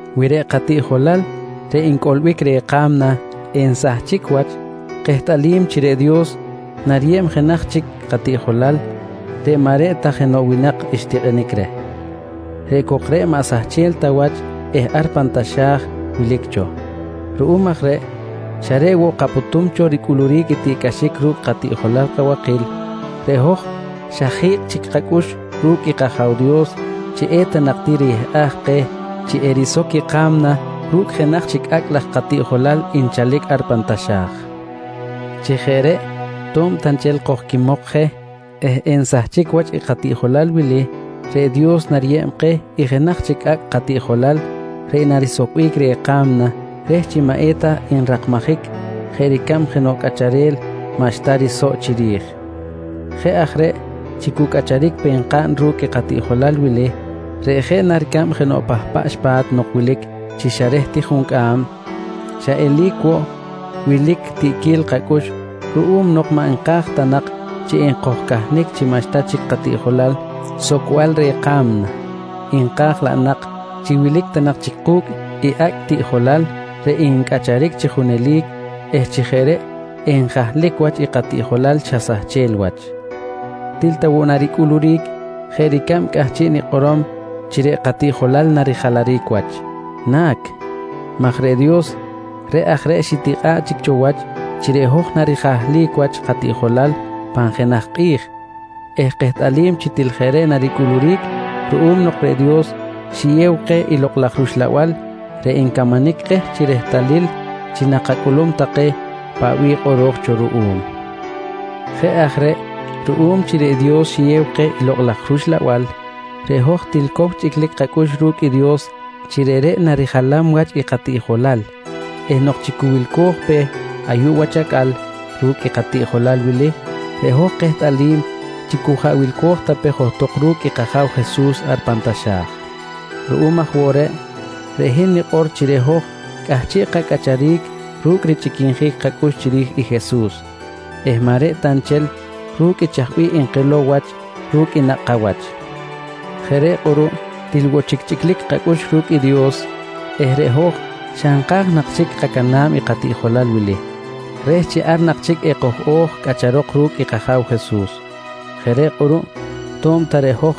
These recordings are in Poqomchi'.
Wi reꞌ katiꞌjolal reꞌ ncꞌolbic reh ka̱mna ensahchic wach, kehtꞌalim chi reꞌ Dios nariyeb jenaj chic katiꞌjolal reꞌ maꞌ reꞌ ta jenoꞌ winak xtikꞌinic reh. Reꞌ cok reꞌ maꞌ sahchel ta wach eh ar pan taxa̱j wilic cho. Ruꞌum aj reꞌ xa reꞌ woꞌ kapꞌutum cho ricꞌuluric i tiꞌcꞌaxic ru̱cꞌ katiꞌjolal kabakil, reꞌ hoj xa ji̱kꞌ chic kacꞌux ru̱cꞌ i kAja̱w Dios chi eta nak ti riyehꞌaj keh chi erisoc i ka̱mna ru̱cꞌ jenaj chic acꞌ laj katiꞌjolal nchalic ar pan taxa̱j. Chi jeꞌ reꞌ to̱b ta nchel kojquimok je eh ensahchic wach i katiꞌjolal wili reꞌ Dios nariyeb keh i jenaj chic acꞌ katiꞌjolal reꞌ narisocbic reh i ka̱mna reh chi maꞌ eta nrakmajic jeꞌ ricab jenoꞌ cꞌacharel maꞌxta risoꞌ chiri̱j. Jeꞌ aj reꞌ chi cu cꞌacharic pe nkaꞌn ru̱cꞌ i katiꞌjolal wili reꞌ jeꞌ na ricab jenoꞌ pahpaꞌx pa̱t nok wilic chi xa reh ti juncꞌam, xa eli̱c woꞌ wilic tiꞌquil kacꞌux ruꞌum nok maꞌ nka̱j ta nak chi ekojcahnic chi maꞌxta chic katiꞌjolal socbal reh i ka̱mna, nka̱j laꞌ nak chi wilic ta nak chic ku̱cꞌ i acꞌ tiꞌjolal reꞌ ncꞌacharic chi junelic eh chi jeꞌ reꞌ enjahlic wach i katiꞌjolal xa sahchel wach. Til ta woꞌ naricꞌuluric jeꞌ ricab cꞌahchiꞌ nikꞌorom chi reꞌ katiꞌjolal narijalaric wach? Na̱c, maj reꞌ i Dios reꞌ aj reꞌ xitikꞌa̱ꞌ chic cho wach chi reꞌ hoj narijahlic wach katiꞌjolal pan jenaj kꞌi̱j eh kehtꞌalim chi til jeꞌ reꞌ naricꞌuluric ruꞌum nok reꞌ Dios xiyew keh i Lokꞌ laj rUxlabal reꞌ ncamanic keh chi rehtalil chi nakacꞌulum take paꞌ bih kꞌoro̱j cho ruꞌum. Jeꞌ aj reꞌ ruꞌum chi reꞌ Dios xiyew keh i Lokꞌ laj rUxlabal, reꞌ hoj til cow chꞌiclic kacꞌux ru̱cꞌ i Dios chi reꞌreꞌ narijalam wach i katiꞌjolal eh nok chi cu wilco̱j pe ayuꞌ wach acꞌal ru̱cꞌ i katiꞌjolal wili reꞌ hoj kehtꞌalim chi cu jaꞌ wilco̱j ta pe johtok ru̱cꞌ i kAja̱w Jesus ar pan taxa̱j. Ruꞌum aj woꞌ reꞌ, reꞌ hin nikꞌor chi reꞌ hoj cꞌahchiꞌ kacꞌacharic ru̱cꞌ richꞌiquinjic kacꞌux chiri̱j i Jesus eh maꞌ reꞌ ta nchel ru̱cꞌ i chaj bih nkilow wach ru̱cꞌ i nakꞌ kawach. Jeꞌ reꞌ kꞌuruꞌ til woꞌ chic chꞌiclic kacꞌux ru̱cꞌ i Dios eh reꞌ hoj xa nka̱j nak chic kacana̱b i katiꞌjolal wili reh chi ar nak chic ekoj-o̱j cꞌacharok ru̱cꞌ i kAja̱w Jesus. Jeꞌ reꞌ kꞌuruꞌ to̱b ta reꞌ hoj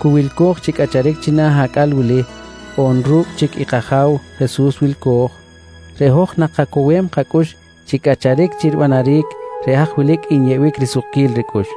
cu wilco̱j chi cꞌacharic china̱ acꞌal wili on ru̱cꞌ chic i kAja̱w Jesus wilco̱j, reꞌ hoj nakacowem kacꞌux chi cꞌacharic chi ribanaric reꞌ haj wilic nyeꞌbic risukquil ricꞌux.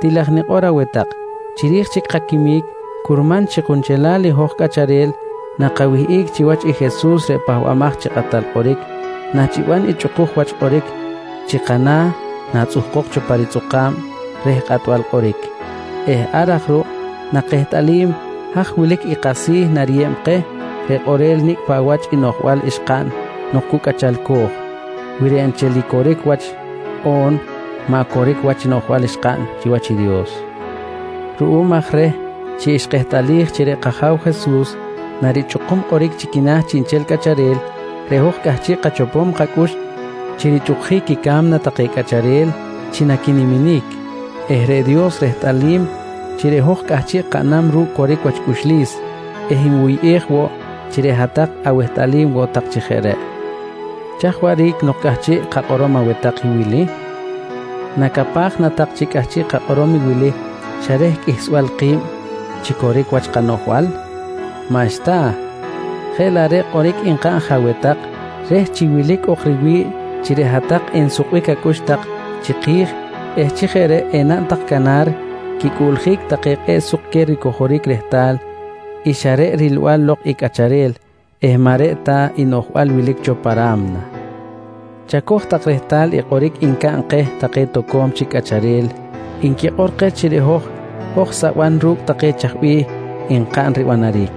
Til aj nikꞌor aweh tak, chiri̱j chic kaquimic curman chi kunchelal i hoj cꞌacharel nakawihꞌic chiwach i Jesus reꞌ Pahbamaj chi Kꞌatal Kꞌoric nachiban i chꞌukuj wach kꞌoric chi kana̱ natzꞌuhkok cho pa ritzꞌukꞌa̱b reh kꞌatbal kꞌoric eh ar aj ruꞌ nakehtꞌalim haj wilic i kasi̱ nariyeb keh reꞌ kꞌorel nicꞌ paꞌ wach i noꞌjbal xkaꞌn nok cu cꞌachalco̱j, wi reꞌ nchel i coric wach on maꞌ coric wach noꞌjbal xkaꞌn chiwach i Dios. Ruꞌum aj reh chi xkehtꞌalij chi reꞌ kAja̱w Jesus narichꞌukum kꞌoric chi quina̱ chiꞌnchel cꞌacharel, reꞌ hoj cꞌahchiꞌ kachopom kacꞌux chi richꞌukjic i ca̱mna take cꞌacharel chi naquiniminic eh reꞌ Dios rehtꞌalim chi reꞌ hoj cꞌahchiꞌ kaꞌnam ru̱cꞌ coric wach cꞌuxlis eh nwuyꞌej woꞌ chi reꞌ hat-tak awehtꞌalim woꞌ tak chi jeꞌ reꞌ. Chaj waꞌric nok cꞌahchiꞌ kakꞌorom aweh tak i wili? Nacapaj na tak chi cꞌahchiꞌ kakꞌorom i wili xa reh qꞌuihsbal ki̱b chi coric wach kanoꞌjbal? Maꞌxta! Jeꞌ laꞌ reꞌ kꞌoric nkaꞌn je aweh tak reh chi wilic ok riwi̱ꞌ chi reꞌ hat-tak ensukbic acꞌux tak chiki̱j eh chi jeꞌ reꞌ enaꞌn tak canar quicꞌuꞌljic take kꞌe̱ꞌ suk queh ricojoric rehtal i xa reꞌ rilbal lok i cꞌacharel eh maꞌ reꞌ ta i noꞌjbal wilic cho pan ra̱mna. Chacoj tak rehtalil i kꞌoric ncaꞌn keh take toco̱m chic cꞌacharel nquikꞌor keh chi reꞌ hoj, hoj saban ru̱cꞌ take chaj bih nkaꞌn ribanaric,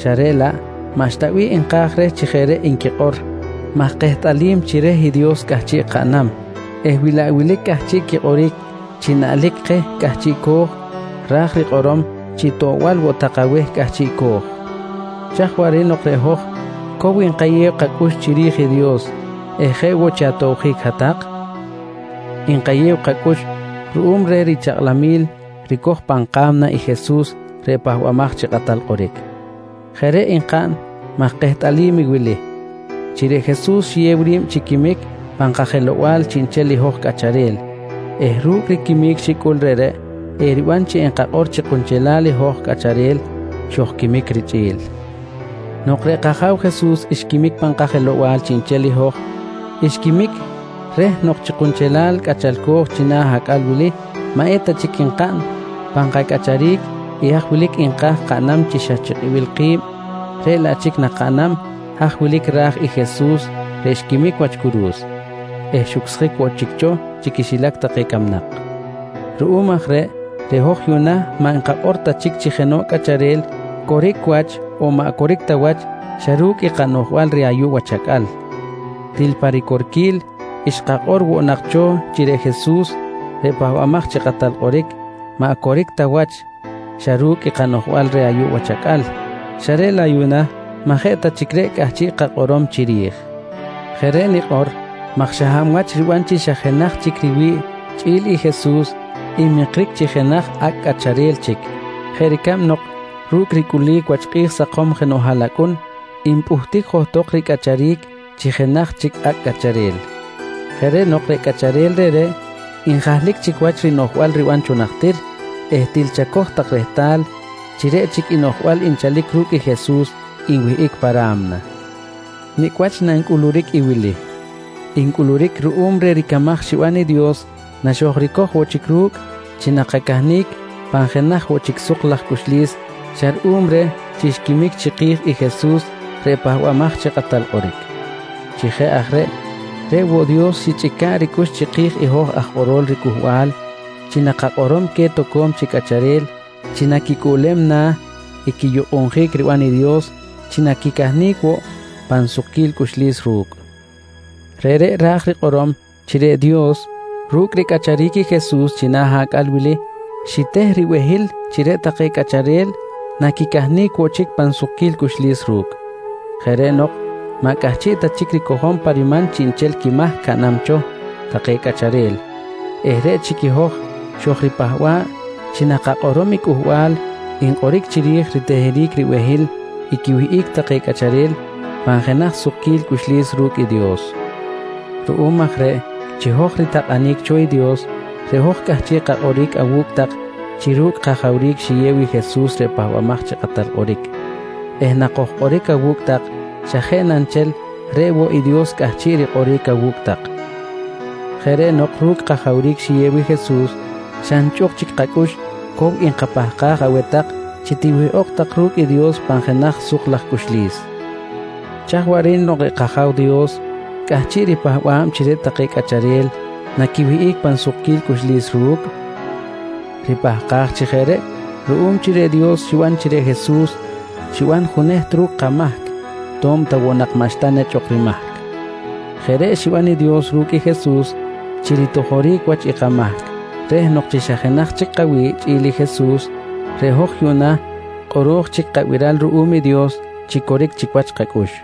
xa reꞌ laꞌ maꞌxta bih nka̱j reh chi jeꞌ reꞌ nquikꞌor maj kehtꞌalim chi reh i Dios cꞌahchiꞌ kaꞌnam eh wilaꞌ wilic cꞌahchiꞌ quikꞌoric chi naꞌlic keh cꞌahchiꞌco̱j ra̱j rikꞌorom chi toꞌbal woꞌ tak aweh cꞌahchiꞌco̱j. Chaj waꞌric nok reꞌ hoj cow nkayew kacꞌux chiri̱j i Dios eh jeꞌ woꞌ chi atobjic hat-tak? Nkayew kacꞌux ruꞌum reh richakꞌlamil ricoj pan ka̱mna i Jesus reꞌ Pahbamaj chi Kꞌatal Kꞌoric. Jeꞌ reꞌ nkaꞌn maj kehtꞌalim i wili: Chi reꞌ Jesus xiyew ri̱b chi quimic pan kajelow-bal chiꞌnchel i hoj cꞌacharel eh ru̱cꞌ i quimic xicꞌul reꞌreꞌ eriban chi enkakꞌor chi kunchelal i hoj cꞌacharel xojquimic richꞌi̱l. Nok reꞌ kAja̱w Jesus xquimic pan kajelow-bal chiꞌnchel i hoj, xquimic reh nok chi kunchelal cꞌachalco̱j china̱ acꞌal wili maꞌ eta chic nkaꞌn pan kacꞌacharic i haj wilic nka̱j kaꞌnam xa chi kibil ki̱b, reꞌ laꞌ chic nakaꞌnam haj wilic ra̱j i Jesus reꞌ xquimic wach curu̱s eh xucsjic woꞌ chic cho chi quixilac take camnak. Ruꞌum aj reꞌ, reꞌ hoj yuꞌna maꞌ nkakꞌor ta chic chi jenoꞌ cꞌacharel coric wach on maꞌ coric wach xa ru̱cꞌ i kanoꞌjbal reh ayuꞌ wach acꞌal. Til pa ricorquil xkakꞌor woꞌ nak cho chi reꞌ Jesus reꞌ Pahbamaj chi Kꞌatal Kꞌoric, maꞌ coric ta wach xa ru̱cꞌ i kanoꞌjbal reh ayuꞌ wach acꞌal, xa reꞌ laꞌ yuꞌna maꞌ jeꞌ ta chic reꞌ cꞌahchiꞌ kakꞌorom chiri̱j. Jeꞌ reꞌ nikꞌor maj xa hab wach riban chi xa jenaj chic riwi̱ꞌ chꞌi̱l i Jesus nmikric chi jenaj acꞌ cꞌacharel chic jeꞌ ricab nok ru̱cꞌ ricꞌulic wach kꞌi̱j sakom jenoꞌ haꞌlacꞌun npꞌuhtic johtok ricꞌacharic chi jenaj chic acꞌ cꞌacharel. Jeꞌ reꞌ nok reꞌ cꞌacharel reꞌreꞌ njahlic chic wach rinoꞌjbal riban cho najtir eh til chacoj tak rehtal chi reꞌ chic i noꞌjbal nchalic ru̱cꞌ Jesus nwihꞌic pa ra̱mna. Nicꞌ wach nancꞌuluric i wili? Ncꞌuluric ruꞌum reh ricamaj xiban i Dios naxojricoj woꞌ chic ru̱cꞌ chi nakacahnic pan jenaj woꞌ chic suk laj cꞌuxlis xa ruꞌum reh chi xquimic chiki̱j i Jesus reꞌ Pahbamaj chi Kꞌatal Kꞌoric. Chi aj jeꞌ reꞌ, reꞌ woꞌ Dios xichꞌica̱ꞌ ricꞌux chiki̱j i hoj aj kꞌorol riCꞌuhbal chi nakakꞌorom queh toco̱m chic cꞌacharel chi naquicꞌuꞌlem na̱ i quiyukꞌunjic riban i Dios chi naquicahnic woꞌ pan sukquil cꞌuxlis ru̱cꞌ. Reꞌreꞌ ra̱j rikꞌorom chi reꞌ Dios ru̱cꞌ ricꞌacharic i Jesus china̱ acꞌal wili xiteh ribehil chi reꞌ take cꞌacharel naquicahnic woꞌ chic pan sukquil cꞌuxlis ru̱cꞌ. Jeꞌ reꞌ nok maꞌ cꞌahchiꞌ ta chic ricojom pa riman chiꞌnchel quimahc caꞌnam cho take cꞌacharel eh reꞌ chic i hoj xojripahba̱ꞌ chi nakakꞌorom i cꞌuhbal nkꞌoric chiri̱j riteheric ribehil i quiwihꞌic take cꞌacharel pan jenaj sukquil cꞌuxlis ru̱cꞌ i Dios. Ruꞌum aj reꞌ chi hoj ritakꞌanic cho i Dios, reꞌ hoj cꞌahchiꞌ kakꞌoric awu̱cꞌ tak chi ru̱cꞌ kajawric xiyew i Jesus reꞌ Pahbamaj chi Kꞌatal Kꞌoric eh nakojkꞌoric awu̱cꞌ tak xa jeꞌ na nchel reꞌ woꞌ i Dios cꞌahchiꞌ rikꞌoric awu̱cꞌ tak. Jeꞌ reꞌ nok ru̱cꞌ kajawric xiyew i Jesus, xa nchꞌuk chic kacꞌux, cow nkapahkaj aweh tak chi tiwihꞌok tak ru̱cꞌ i Dios pan jenaj suk laj cꞌuxlis. Chaj waꞌric nok reꞌ kAja̱w Dios cꞌahchiꞌ ripahkam chi reꞌ take cꞌacharel naquiwihꞌic pan sukquil cꞌuxlis ru̱cꞌ? Ripahkaj chi jeꞌ reꞌ ruꞌum chi reꞌ Dios xiban chi reꞌ Jesus xiban juneht ru̱cꞌ kamahc to̱b ta woꞌ maꞌxta nak nechꞌ ok rimahc. Jeꞌ reꞌ xiban i Dios ru̱cꞌ i Jesus chi ritojoric wach i kamahc reh nok chi xa jenaj chic kawi̱ꞌ chꞌi̱l i Jesus, reꞌ hoj yuꞌna kꞌoro̱j chic kabiral ruꞌum i Dios chi coric chic wach kacꞌux.